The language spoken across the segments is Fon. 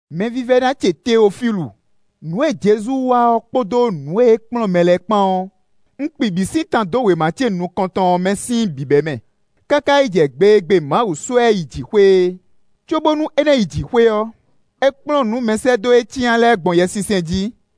Mɛvívɛ́ná ce Teofílu! Nǔ e Jezu wa ɔ́ kpódó nǔ e é kplɔ́n mɛ lɛ́ɛ kpán ɔ́, un kpi bǐ sín tan dó wěma ce nukɔn tɔn ɔ́ mɛ sín bǐbɛ́mɛ, káká yi jɛ gbe e gbe Mawu sɔ́ ɛ yi jǐxwé é. Cóbónú é ná yi jǐxwé ɔ́, é kplɔ́n nǔ mɛsɛ́dó e é cyán lɛ́ɛ gbɔn Yɛsinsɛn jí.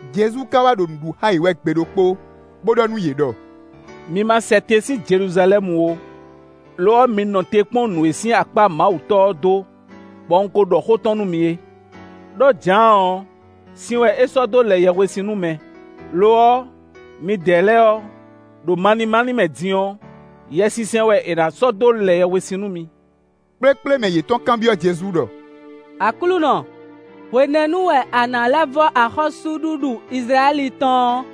Jezu ka wá ɖo nǔ ɖu xá yě wɛ gbe ɖokpó, bó ɖɔ nú yě ɖɔ: “Mi ma sɛ tɛn sín Jeluzalɛ́mu ó, lo ɔ́, mi nɔ te kpɔ́n nǔ e sín akpá Mawu Tɔ́ ɔ́ dó, bɔ un ko ɖɔ xó tɔn nú mi é. Đó Jǎan ɔ́, sin wɛ é sɔ́ dó lɛ yɛhwesin nú mɛ; lo ɔ́, midɛɛ lɛ́ɛ ɔ́, ɖo malín málín mɛ din ɔ́, Yɛsinsɛn wɛ è nǎ sɔ́ dó lɛ yɛhwesin nú mi.” Kplékplé mɛ yětɔn kanbyɔ́ Jezu ɖɔ: “Aklúnɔ, hwenɛ́nu wɛ a nǎ lɛ́ vɔ́ axɔ́súɖuɖu Izlayɛ́li tɔn ɔ́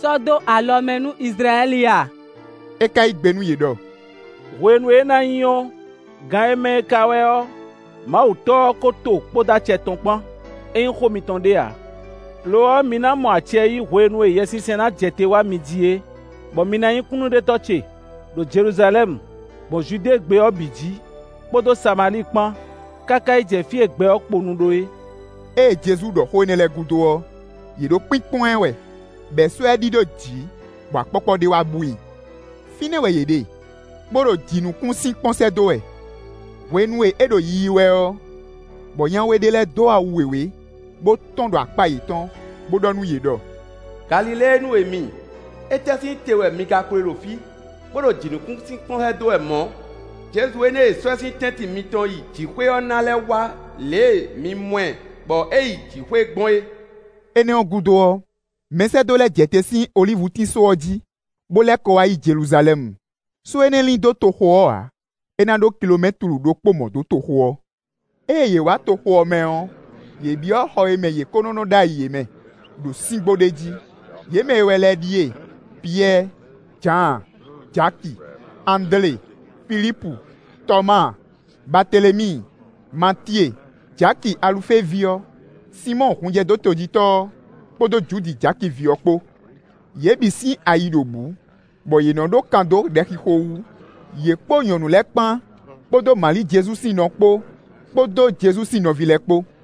sɔ́ dó alɔ mɛ nú Izlayɛ́li a?” É ka yí gbe nú yě ɖɔ: “Hwenu e é ná nyí ɔ́, gan e mɛ ka wɛ ɔ́, Mawu Tɔ́ ɔ́ ko to kpódó acɛ tɔn kpán; é nyí xó mitɔn ɖé ǎ. Lo ɔ́, mi ná mɔ acɛ yí hwenu e Yɛsinsɛn ná jɛ te wá mi jí é, bɔ mi na nyí kúnnuɖetɔ́ ce, ɖo Jeluzalɛ́mu, gbɔn Judée gbé ɔ́ bǐ jí, kpódó Samalíi kpán, káká yi jɛ fí e gbɛ ɔ́ kponu ɖó é.” Ée Jezu ɖɔ xó énɛ́ lɛ́ɛ gúdo ɔ́, yě ɖo kpínkpɔ́n ɛ wɛ, bɔ è sɔ́ ɛ ɖidó jǐ bɔ akpɔ́kpɔ́ ɖé wá bú i. Fínɛ́ wɛ yě ɖe, bó ɖo jǐnukúnsin kpɔ́n sɛ́ dó wɛ hwenu e é ɖo yiyi wɛ ɔ́, bɔ nya we ɖé lɛ́ɛ dó awu wěwé, bó tɔ́n ɖo akpá yětɔn, bo ɖɔ nú yě ɖɔ: “Galiléenu e mi! Étɛ́ sín te wɛ mi ka kpo ɖe ɖo fí, bó ɖo jǐnukúnsin kpɔ́n sɛ́ dó wɛ mɔ̌? Jezu énɛ́ e è sɔ́ sín tɛ́ntin mitɔn yi jǐxwé ɔ́ ná lɛ́ wá lě e mi mɔ ɛ, bɔ é yi jǐxwé gbɔn é.” Énɛ́ ɔ́ gúdo ɔ́, mɛsɛ́dó lɛ́ɛ jɛ te sín olívutín só ɔ́ jí, bó lɛ́ kɔ wá yi Jeluzalɛ́mu; só énɛ́ lín dó toxo ɔ́ ǎ; é ná ɖó kilomɛ́tlu ɖokpó mɔ̌ dó toxo ɔ́. Ée yě wá toxo ɔ́ mɛ ɔ́, yě byɔ́ xɔ e mɛ yě ko nɔ́ nɔ ɖ'ayǐ é mɛ, ɖo síngbó ɖé jí. Yě mɛ e wɛ lɛ́ɛ ɖíe: Piyɛ́ɛ, Jǎan, Jaki, Andlé, Filípu, Tɔmáa, Baatelemíi, Matíe, Jaki Alufée ví ɔ́, Sinmɔ́ɔ hunjɛdótojítɔ́ ɔ́, kpódó Judi Jaki ví ɔ́ kpó. Yě bǐ sín ayi ɖo bǔ, bɔ yě nɔ́ ɖó kan dó ɖɛxixo wú, yě kpódó nyɔ̌nu lɛ́ɛ kpán, kpódó Mali Jezu sín nɔ kpó, kpódó Jezu sín nɔví lɛ́ɛ kpó.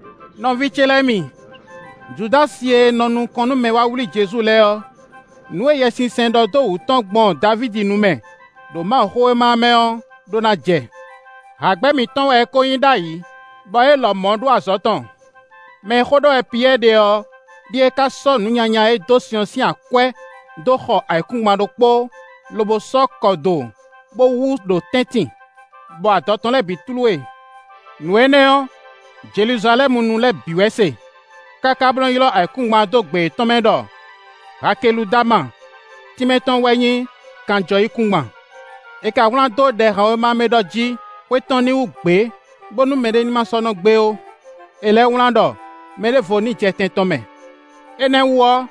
“Nɔví ce lɛ́ɛ mi! Judási e nɔ nukɔn nú mɛ e wá wlí Jezu lɛ́ɛ ɔ́, nǔ e Yɛsinsɛn ɖɔ dó wǔtu tɔn gbɔn Davídi nu mɛ, ɖo Mawuxówéma ɔ́ mɛ ɔ́ ɖó ná jɛ. Hǎgbɛ́ mǐtɔn wɛ é kó nyí ɖ'ayǐ, bɔ é lɔmɔ̌ ɖó azɔ̌ tɔn.” Mɛ e xó ɖɔ wɛ Piyɛ́ɛ ɖe ɔ́ ɖíe ka sɔ́ nǔ nyanya e é dó sin ɔ́ sín akwɛ́ dó xɔ ayǐkúngban ɖokpó, lobo sɔ́ kɔ do, bó wú ɖo tɛ́ntin, bɔ adɔ tɔn lɛ́ɛ bǐ tlú e. Nǔ énɛ́ ɔ́, Jeluzalɛ́munu lɛ́ɛ bǐ wɛ se, káká bó nɔ́ ylɔ́ ayǐkúngban ɔ́ dó gbe yětɔn mɛ ɖɔ “Hakeludama” tínmɛ tɔn wɛ nyí “kanjɔyíkúngban.” “È ka wlán dó Ɖɛhanwéma mɛ ɖɔ jí: ‘Xwé tɔn ní wú gbě, bónú mɛɖé ní ma sɔ́ nɔ gbe ó.’ È lɛ́ wlán ɖɔ: ‘Mɛ ɖěvo ní jɛ tɛn tɔn mɛ.’ “Énɛ́ wú ɔ́,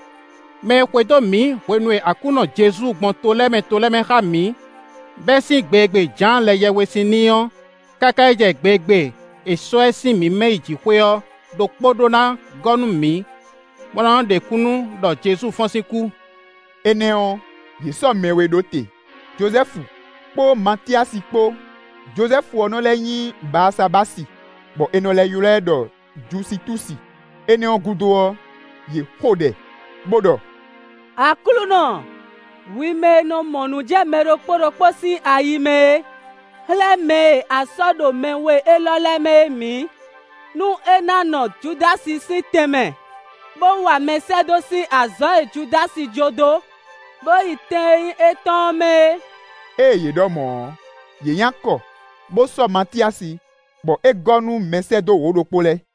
mɛ e xwedó mǐ hwenu e Aklúnɔ Jezu gbɔn to lɛ́ɛ mɛ to lɛ́ɛ mɛ xá mǐ, bɛ́ sín gbe e gbe Jǎan lɛ yɛhwesin n'i ɔ́ káká yi jɛ gbe e gbe è sɔ́ ɛ sín mǐ mɛ yi jǐxwé ɔ́ ɖokpó ɖó ná gɔ́ nú mǐ, bó ná nɔ́ ɖe kúnnu ɖɔ Jezu fɔ́n sín kú.” Énɛ́ ɔ́, yě sɔ́ mɛ we ɖó te: Jozɛ́fu kpó Matyasi kpó; Jozɛ́fu ɔ́ nɔ́ lɛ́ nyí Baasabási, bɔ è nɔ lɛ́ ylɔ́ ɛ ɖɔ Jusitúsi. Énɛ́ ɔ́ gúdo ɔ́, yě xo ɖɛ, bó ɖɔ: “Aklúnɔ, hwi mɛ e nɔ mɔ nǔ jɛ mɛ ɖokpó ɖokpó sín ayi mɛ é, xlɛ́ mɛ e a sɔ́ ɖo mɛ we élɔ́ lɛ́ɛ mɛ é mǐ, nú é ná nɔ Judási sín tɛn mɛ, bó wa mɛsɛ́dó sín azɔ̌ e Judási jó dó, bó yi tɛn e nyí étɔn ɔ́ mɛ é.” Ée yě ɖɔ mɔ̌ ɔ́, yě nyi akɔ, bó sɔ́ Matyasi, bɔ é gɔ́ nú mɛsɛ́dó wǒ-ɖokpó lɛ́ɛ.